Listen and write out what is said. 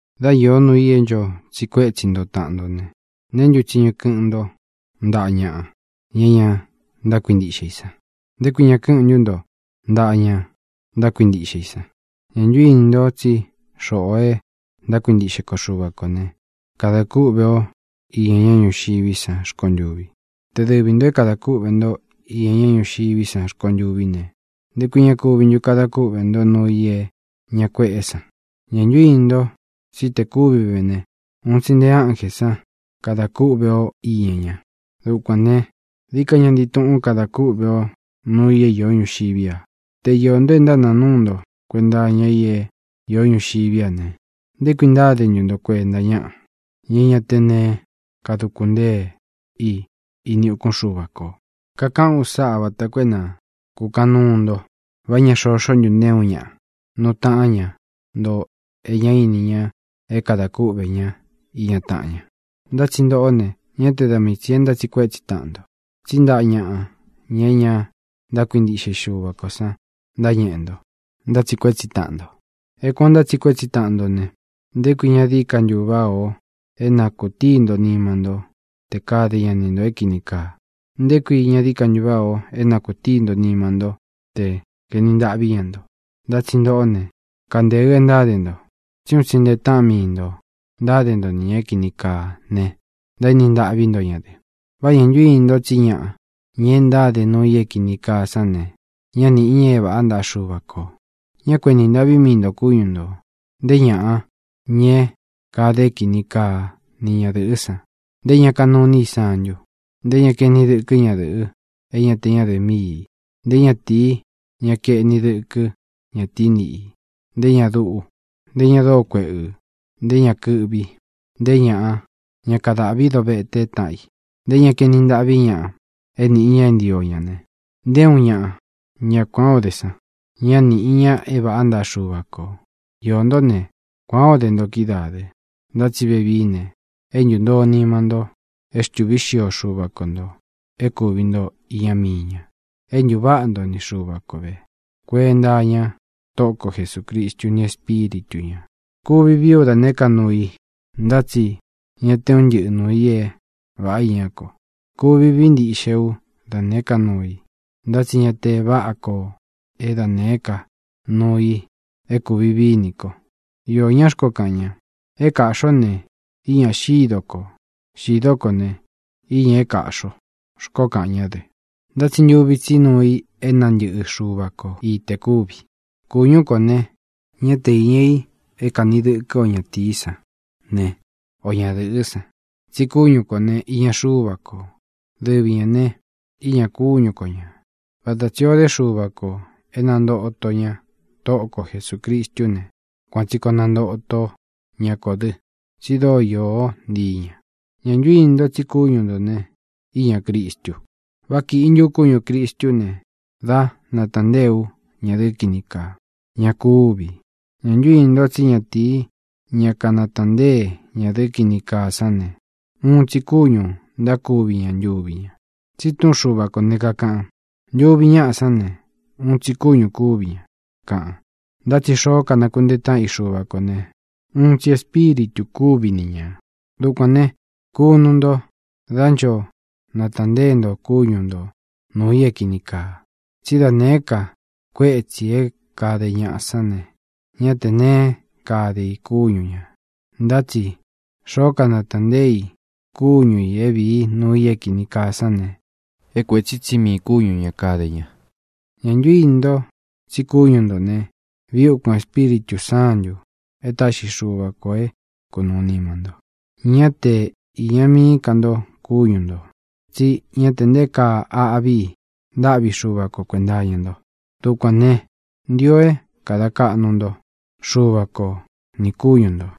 Dá īó nuu i é ncho tsiꞌi kuétsi nto taꞌan nto ne, ¿neé ntu tsiñu kɨꞌɨn nto ntaꞌa ñaꞌa, ña é ña ntákuintiꞌxe i san? ¿Nté kui ña kɨꞌɨn ntu nto ntaꞌa ña ntákuintiꞌxe i san? ¿Ñā ntu íni nto tsí xoꞌō e ntákuintiꞌxe ko Xuva kō ne, kada kúꞌve o iña ña ñúxiví san rkontuvi? Te dɨvi ntō é kadā kúꞌvē ntó iña ña ñúxiví san rkontuví ne, ¿nté kui ña kuvi ntu kada kúꞌvē ntó nuu i é ña kueꞌé san? ¿Ñā ntu íni nto tsí te kúvi ve ne, un tsi nte ánjē sán kada kúꞌve o iña ña? Dukuān ne, dií ka ña ntii tuꞌun kada kúꞌve ó nuu i é īó ñuxiví a. Te iō nto e ntánāa núu nto kuenta iña i é īó ñuxiví a ne, ¿nté kui ntáde ntu nto kuenta ñaꞌa, ña é ña té neé kaduku ntée i ini ukún Xuva kō? Kakaꞌán u sáꞌa vata koo é na kūkaꞌan nuu nto. ¿Vá ña xoxó ntu nté uun ñaꞌa nuu taꞌán ña nto e ñá ini ña é kadā kúꞌvē ñá iña taꞌan ña? Ntá tsi ntoꞌó ne, ñá te da mii tsī e ntátsiꞌi kuetsi taꞌan nto, tsí ntaꞌa ñaꞌa, ña é ña ntákuintiꞌxe i Xuva kō san ntáñeꞌe nto, ntátsiꞌi kuetsi taꞌan nto. É kuān ó ntátsiꞌi kuetsi taꞌan nto ne, ¿nté kui ña dií ka váꞌā ó é na kūtií nto nima ntó te kade ña ni ntō é kīni kaa? ¿Nté kui ña dií ka váꞌā ó é na kūtií nto nima ntó tē kaeni ntaꞌví ña nto? Ntá tsi ntoꞌó ne, kantēɨ é ntáde nto. Tsí un tsi nte taꞌan mii nto ntáde nto ni ñā é kīni kaa ne, ntaéni ntaꞌví nto ña dɨ. ¿Vá ñā ntu íni nto tsí ñaꞌa, ña e ntáde nuu i é kīni kaa sán ne, ñá nīꞌi ña é vāꞌá ntaꞌa Xuva kō? Ñá ku enī ntaꞌví mii ntō kúñu ntō; nté ñāꞌa, ña é kāde é kini kaa ni ñadɨ̄ꞌɨ́ san, nté ñā kanuu iní i santu, nté ñā kaeni dɨkɨ́ ñadɨ̄ꞌɨ é ña te ñádɨ̄ꞌɨ míi ī, nté natīi, ña kaeni dɨkɨ́ ñatií niꞌi i, nté ñā duꞌú, nté ñā dóo kueꞌɨ̄, nté ñā kɨꞌvi, nté ñāꞌa, ña kadáꞌvi dovete táꞌan i, nté ñā kaeni ntaꞌví ñaꞌa é nīꞌi ña é ntio ña ne, nté uun ñaꞌa, ña kuān ó de san, ñá nīꞌi ña é vāꞌá ntaꞌa Xuva kō. Iō ntó ne, kuan ō dé nto kídaā dɨ. Ntá tsi vevií ne, é ntūntoo nima nto. É xtūví xio Xuva ko ntō é kūvi nto iña mii ña. É ntūváꞌa nto ni Xuva ko vē, kuenta iña Tóꞌo ko Jesūcristu ni Espíritu ñā. Kuvi vií u da nēé ka nuu i, ntá tsi ña te un ntɨ́ꞌɨ nuū i é vāꞌá iñá ko. Kuvi vií ntiꞌxe ú da nēé ka nuu i, ntá tsi ña da váꞌa ko é da nēé ka nuu i é kūvi vií nī ko. Iō ñaꞌa xkoó kaꞌan ña: “É kāꞌxi o ne, iña xído ko. Xīdó kō ne, iña é kāꞌxi o”, xkoó kaꞌan ñá dɨ. Ntá tsi ntuvi tsi nuu i é nantɨꞌɨ Xúva ko i te kuvi. Kūñú kō ne, ñá te iña i é kanī dɨkɨ́ ō ñatīí san ne, o ñadɨ̄ꞌɨ́ san, tsí kúñu kō ne, iña Xuva ko. Dɨvi ñā ne, íñā kúñu ko ñā. Vata tsī o dé Xuva kō e nantóto ña Tóꞌo kō Jesucristú ne, kuan tsī koo nantóto ña kō dɨ́, tsi dóo iō ntíi ña. ¿Ñā ntu íni nto tsi kúñu ntō ne, íñā Cristu? ¿Vá kīꞌi ntu ú kúñū Cristú ne, dá nataꞌan ntée ú ñadɨ̄ꞌɨ́ kini kaa? ¡Ña kúvi! ¿Ñā ntu íni nto tsí ñatīi, ña kanataꞌan nteé ñadɨ̄ꞌɨ́ kini kaa sán ne, uun tsi kúñū ntákuvi ña ntuvi ña? Tsí túꞌun Xuva kō ne, kakaꞌan: “Ntuvi ñáꞌa sán ne, uun tsi kúñu kūvi ña”, kaꞌan. Ntá tsi tē xoó kanakuntee táꞌan i Xuva kō ne, uun tsi espíritū kúvi ni ñā. Dukuān ne, kunu nto dá ncho natāꞌan ntée nto kúñu nto nūu i é kīni kaa. Tsí da nēé ka kuétsī é kāde ñaꞌa sán ne, ñá tē neé kade i kúñu ñā. Ntá tsi xoo kanatāꞌan ntée i kúñu ī é vīi núu i é kīni kaa sán ne, é kuētsí tsi mii kúñu ñā kade ña. ¿Ñā ntu íni nto tsí kúñu ntō ne, viꞌi úkūn Espíritū Sántū e táꞌxi Xuva kō é kunūu nima nto? Ñá te īña mií ka nto kúñu ntō, tsí ña te nté kaa aꞌví i ntáꞌvi Xuva ko kuēnta iña nto. Dukuān ne, ntio é kada kaꞌnu nto Xuva ko nī kúñu ntō.